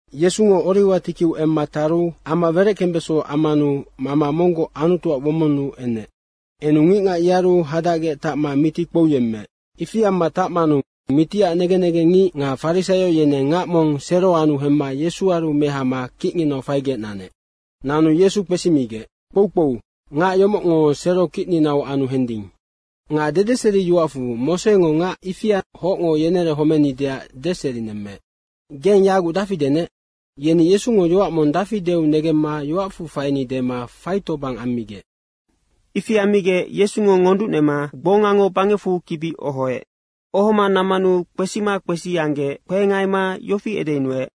Yesungo oriwa tikiu emma taru ama wereckembeso ammanu mama monggoc Anutuac womonnu enec. Enu ngicngac yearu hadacgec tacma miti kpouyemmeec. Ifi amma tacmanu mitiac negen negengngic nga farisaio yeneng ngac mong sero anu hemma Yesuaru mehama kicnginau faigec nanec. Nanu Yesu kpesimigec, “Kpoukpou, ngac yomocngo sero kicninau anu hending. Nga dedeseriyoacfu Mosengo ngac ifianoc hocngo yenerehomenideac deserinemmeec. Geng yaguc dafi denec?” Yeni Yesungo yoac mong dafi deu negemma yoacfu faini dema faitobang ammigec. Ifi ammigec Yesungo ngonducnema gbongango bangecfu kibi ohoec. Ohoma nammanu kpesima kpesi anggec kpehengaima yofi edeyunuec,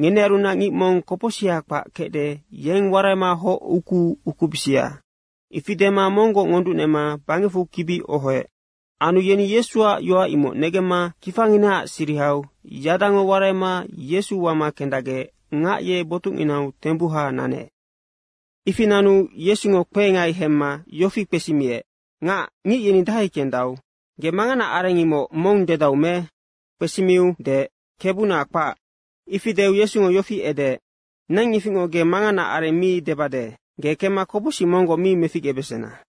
“Ngenearunac ngic mong kopocsiha kpac kecde, yeng waraima hoc ukuu ukubisia.” Ifi dema monggoc ngonducnema bangecfu kibi ohoec. Anu yeni Yesuac yoac imoc negemma kifanginaac sirihau yadango waraima Yesu wama kendacgec ngac ye botucnginau tembuha nanec. Ifi nanu Yesungo kpehengai hemma yofi kpesimiec, “Ngac, ngic yeni dahai kendau? Ge manganaac areng, imoc mong dedau me?” Kpesimiu deec, “Kebuna, kpac.” Ifi deu Yesungo yofi edeec, “Neng ifingoc ge mangana areng mi debade. Ge kemma kopocsic monggoc mi meficgebesena.”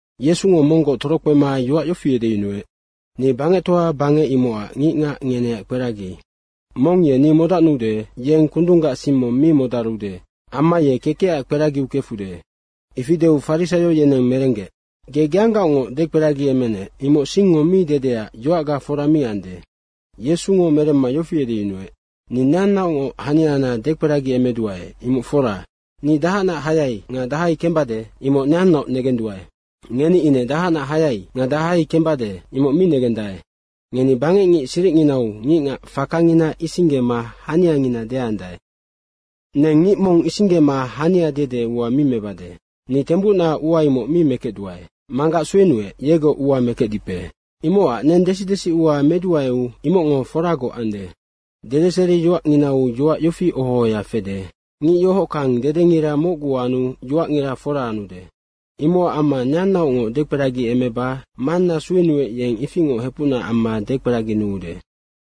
Yesungo monggoc torokpema yoac yofi edeyunuec, “Ni bangectoa bangec imocac ngicngac ngeneac kperagi. Mong ye ni modacnude, yeng kundunggac sing mong mi modarude. Amma ye kekecac kperagiu kefude.” Ifi deu farisaio yeneng merenggec, “Ge geanggaocngoc dekperagiemenec, imoc singngo mi dedeac yoacga fora mi ande.” Yesungo meremma yofi edeyunuec, “Ni neannaocngoc haniana dekperagiemeduae, imoc fora. Ni dahacnac hayai nga dahai kembade, imoc neannaoc negenduae. Ngeni ine dahacnac hayai nga dahai kembade, imoc mi negendae. Ngeni bangecngic siricnginau ngicngac fakangina isinggema haniangina deandae. Neng ngic mong isinggema hania dede ua mi mebade. Ni tembucna ua imoc mi mekecduae. Manggac suenuec, yegoc ua mekecdipe. Imocac neng desi desiua meduaeu imocngo foragoc ande. Dedeseriyoacnginau yoac yofi oho ohoya fede, ‘Ngic yohockang dedengira mocgu anu yoacngira fora anude.’ Imocac amma neannaocngoc dekperagiemeba Manna suenuec, yeng ifingoc hepucna amma dekperaginuude.”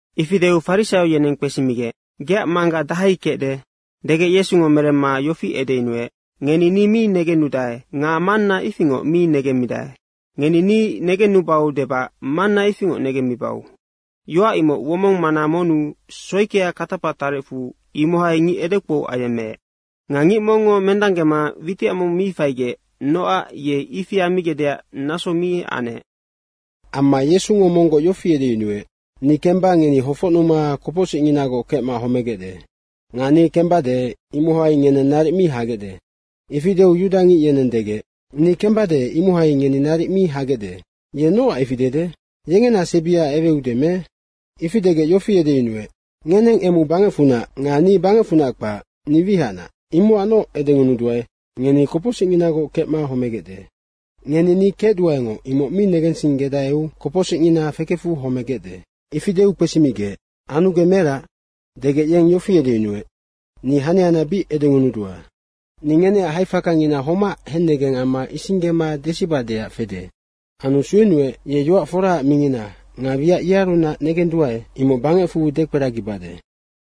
Ifi deu farisaio yeneng kpesimigec, “Geac Mangga dahai kecde?” degec Yesungo meremma yofi edeyunuec, “Ngeni ni mi negennudae nga Manna ifingoc mi negemmidae. Ngeni ni negennubau debac Manna ifingoc negemmibau.” Yoac imoc, womonggac mana monnu soikia katapa tarecfu, imohai ngic edekpou ayemmeec. Nga ngic mongngo mendanggema witicamau mi faigec nocac ye ifi ammigecdeac naso mi anec. Amma Yesungo monggoc yofi edeyunuec, “Ni kemba ngeni hofocnuma kopocsicnginagoc kecma homegecde. Nga ni kembade, imohai ngeneng naric mi hagecde.” Ifi deu yudangic yeneng degec, “Ni kembade, imohai ngeni naric mi hagecde. Ye nocac ifi dede? Yengena sebia eweude me?” Ifi degec yofi edeyunuec, “Ngeneng emu bangecfunac nga ni bangecfunac kpac, ni wihacnac. Imocacnoc edengunuduae, ngeni kopocsicnginagoc kecma homegecde. Ngeni ‘ni kecduaengoc’, imoc mi negensinggedaeu kopocsicngina fekefu homegecde.” Ifi deu kpesimigec, “Anu ge merac?” degec yeng yofi edeyunuec, “Ni haniana bic edengunudua. Ni ngeneac haifakangina homac hennegeng amma isinggema desibadeac fede. Anu suenuec, ye yoac foraac mingina nga wiac yearunac negenduae, imoc bangecfu dekperagibade.”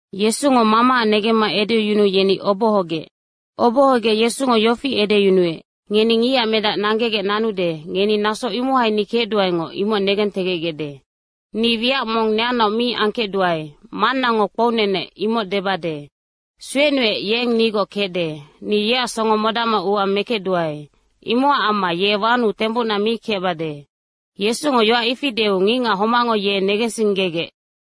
Yesungo Mamaac negemma edeyunuu yeni obohogec. Obohogec Yesungo yofi edeyunuec, “Ngeni Ngicac Medac nanggegec nanude, ngeni naso imohai ‘ni kecduaengoc’, imoc negentegecgecde. Ni wiac mong neannaoc mi angkecduae, Mannango kpounenec, imoc debade. Suenuec, yeng nigoc kecde. Ni yeac songo modacma ua mekecduae. Imocac amma ye wanuu tembucna mi kecbade.” Yesungo yoac ifi deu ngicngac homacngo ye negensinggegec.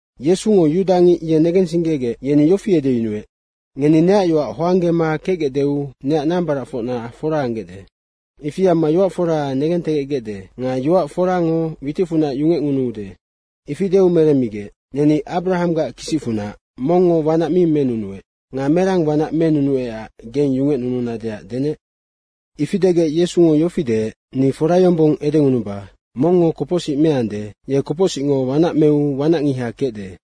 Yesungo yudangic ye negensinggegec, yeni yofi edeyunuec, “Ngeni neac yoac hoanggema kecgecdeu neac medacfocna fora anggecde. Ifi amma yoac fora negentegecgecde nga yoac forango witicfunac yungecngunuude.” Ifi deu meremmigec, “Neni Abrahanggac kisicfunac, mongngo wanac mi menunuec. Nga merang wanac menunuecac geng yungecnununadeac denec?” Ifi degec Yesungo yofi deec, “Ni fora yombong edengunuba, mongngo kopocsic meande, ye kopocsicngo wanac meu wanacngiha kecde.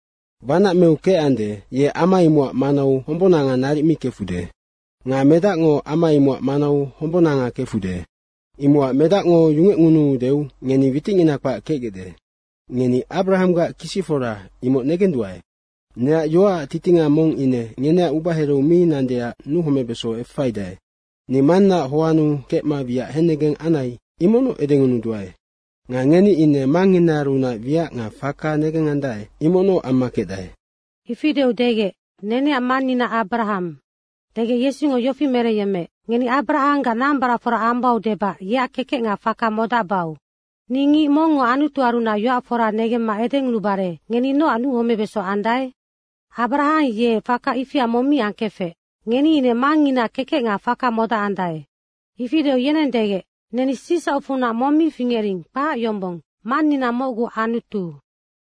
Wanac meu kecande, ye ama imocac manau hombonanga naric mi kefude. Nga Medacngo ama imocac manau hombonanga kefude. Imocac Medacngo yungecngunuudeu ngeni witicngina kpac kecgecde. Ngeni Abrahanggac kisicfora, imoc negenduae. Neac yoacac titinga mong ine ngeneac ubahereu mi nandeac nuhomebeso efaidae. Ni Mannaac hoannu kecma wiac hennegeng anai, imocnoc edengunuduae. Nga ngeni ine mangnginaarunac wiac nga faka negengandae, imocnoc amma kecdae.” Ifi deu degec, “Neneac mannina Abrahang.” degec Yesungo yofi merengyemmeec, “Ngeni Abrahanggac nambaracfora ambau debac yeac kekec nga faka modacbau. Ni ngic mongngo Anutuarunac yoac fora negemma edengunubare ngeni nocac nuhomebeso andae? Abrahang ye faka ifia mong mi angkefec. Ngeni ine mangnginaac kekec nga faka modacandae.” Ifi deu yeneng degec, “Neni sicsaucfunac mong mi fingering, kpac yombong. Mannina mocgu Anutu.”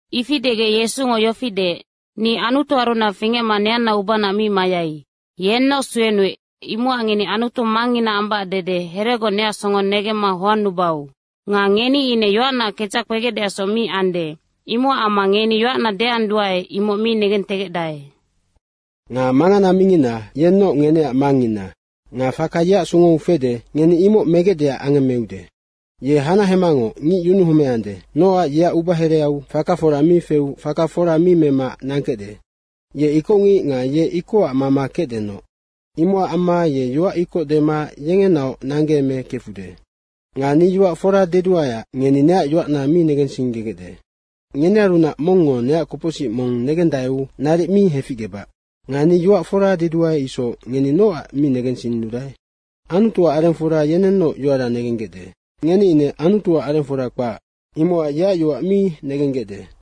Ifi degec Yesungo yofi deec, “Ni Anutuarunac fingecma neanna ubanaac mi mayai. Yennoc suenuec, imocac ngeni Anutu mangngina ambac dede heregoc neac songo negemma hoannubau. Nga ngeni ine yoacnaac kedzac kpegecdeacsoc mi ande, imocac amma ngeni yoac deanduae, imoc mi negentegecdae. Nga mangana mingina, yennoc ngeneac mangngina nga faka yeac songou fede, ngeni imoc megecdeac angemmeude. Ye hanahemangoc ngic yunuhomeande nocac yeac ubahereau faka fora mi feu faka fora mi mema nangkecde. Ye ikocngic nga ye ikocac mama kecdenoc. Imocac amma ye yoac ikoc dema yengenaoc nanggeeme kefude. Nga ni yoac fora deduaeac ngeni neac yoacna mi negensinggegecde. Ngenearunac mongngo neac kopocsic mong negendaeu naric mi heficgebac. Nga ni yoac fora deduae isoc ngeni nocac mi negensinnudae? Anutuac arengfora yenennoc yoara negenggecde. Ngeni ine Anutuac arengfora kpac, imocac yeac yoac mi negenggecde.”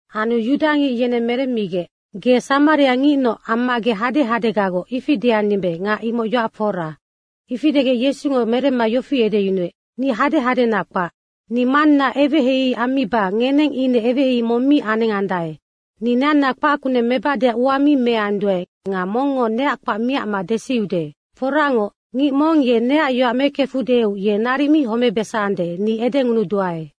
Anu yudangic yeneng meremmigec, “Ge samariangicnoc amma ge hadehadegagoc, ifi deandimbe nga imoc yoac fora.” Ifi degec Yesungo meremma yofi edeyunuec, “Ni hadehadena kpac. Ni Manna eweheihei ammiba ngeneng ine eweheihei mong mi anengandae. Ni neanna kpac kuneng mebadeac ua mi meanduae nga mongngo neac kpac miacma desiude. Foracngoc, ngic mong ye neac yoac mekefudeu, ye naric mi homebesande, ni edengunuduae.”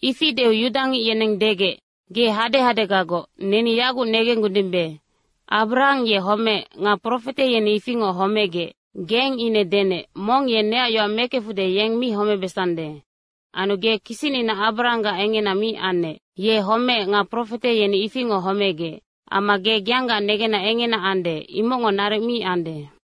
Ifi deu yudangic yeneng degec, “Ge hadehadegagoc, neni yaguc negenggudimbe. Abrahang ye homeec nga profete yeni ifingoc homegec. Geng ine denec, ‘Mong ye neac yoac mekefude, yeng mi homebesande.’ Anu ge kisicnina Abrahanggac engena mi annec. Ye homeec nga profete yeni ifingoc homegec. Amma ge geanggaac negenna engena ande, imocngo naric mi ande.”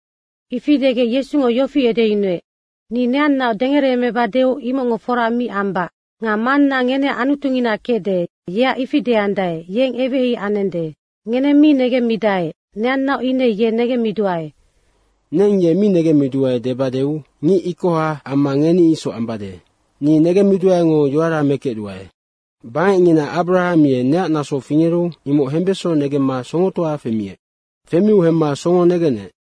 Ifi degec Yesungo yofi edeyunuec, “Ni neannaoc dengereemebadeu imocngo fora mi ambac. Nga Manna ngeneac Anutungina kecde, yeac ifi deandae, yeng eweheihei anende. Ngeneng mi negemmidae, neannaoc ine ye negemmiduae. Neng ye mi negemmiduae debadeu, ngic ikoha amma ngeni isoc ambade. Ni negemmiduaengo yoara mekecduae. Bangecngina Abrahang ye neac naso fingeru imoc hembeso negemma songotoa femiec. Femiu hemma songo negenec.”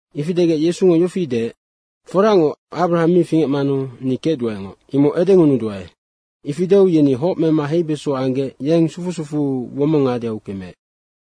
Ifi degec Yesungo yofi deec, “Foracngoc, Abrahang mi fingecmanu ‘ni kecduaengoc’, imoc edengunuduae.” Ifi deu yeni hoc mema heibeso anggec yeng sufu sufuu womong ngadeau kemeec.